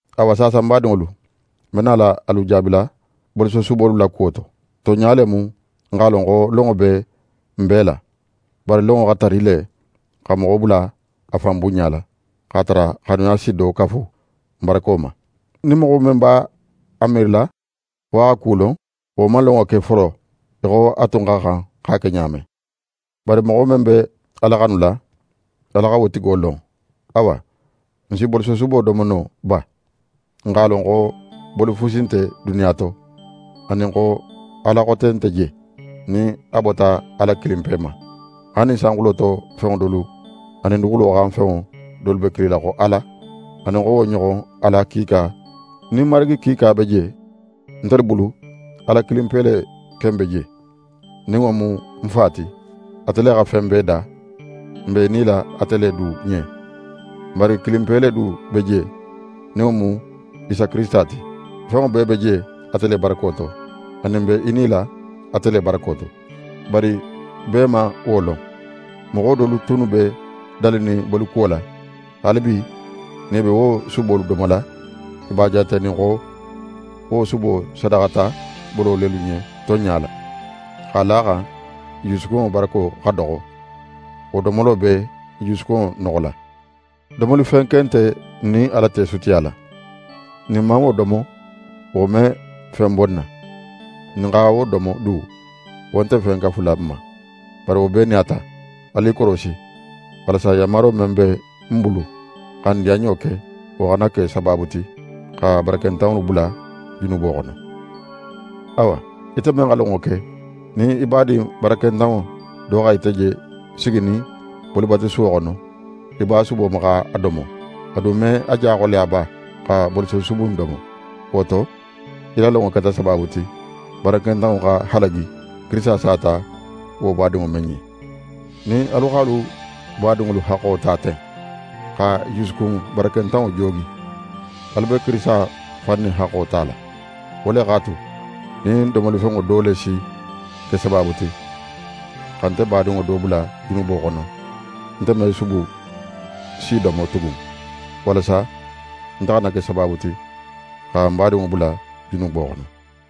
Awa, saasa ń badinŋolu, ń be nala alu jaabila bolisosubolu la kuwo to. Tonɲa le mu n x'a lon xo lonŋo be n bee la. Bari lonŋo xa tari le xa moxo bula a fan bunɲala, x'a tara xanuya si do kafu n barako ma. Nin moxo men b'a miirila xo a xa ku lon, wo man lonŋo ke folo í xo a tun xa xan x'a ke ɲa men. Bari moxo men be Ala xanula, Ala xa wo tigo lon. Awa, n si bolisosubo domo no ba? N x'a lon xo boli fusi nte duniya to, anin xo ala xote nte je, nin a bota Ala kilinpe ma. Haali nin sanxulo to fenŋo dolu anin duguxulo xan fenŋo dolu be kilila xo ala, anin xo wo ɲoxon ala kiika nin marigi kiika be je, ntelu bulu, Ala kilinpe le ken be je, nin wo mu n Fa ti. Ate le xa fen bee da; n be i nila ate le du ɲen. Marigi kilinpe le du be je, nin wo mu Isa Kirisita ti. Fenŋo bee be je ate le barako to; anin n be i nila ate le barako to. Bari bee man wo lon. Moxo dolu tunnu be dalinin bolikuwo la, haalibi nin i be wo subolu domola, i b'a jaatenin xo wo subo sadaxata bolo lelu ɲen tonɲa la. X'a la a xan i jusukunŋo barako xa doxo, wo domolo be i jusukunŋo noxola. Domolifen ken nte n nin Ala te sutiyala. Nin n man wo domo, wo me fen bo n na. Nin n xa wo domo du, wo nte fen kafula n ma. Bari wo bee nin a ta, alu i korosi; walasa yanmaro men be n bulu xa n diyanɲo ke, wo xana ke sabaabu ti xa barakentanŋolu bula junubo xono. Awa, ite men xa lonŋo ke, nin í badin barakentanŋo do xa ite je siginin bolibatusuwo xono í b'a subo ma x'a domo, a du me a ja xoleya ba xa bolisosubu in domo? Wo to, í la lonŋo keta sabaabu ti, barakentanŋo xa halagi, Kirisita sata wo badinŋo men ɲen. Nin alu x'alu badinŋolu haxxo ta ten, xa i jusukun barakentanŋo joogi, alu be Kirisita fan ne haxxo tala. Wo le x'a tu, nin domolifenŋo do le si ke sabaabu ti xa nte badinŋo do bula junubo xono, nte me subu si domo tugun; walasa nte xana ke sabaabu ti xa ń badinŋo bula junubo xono.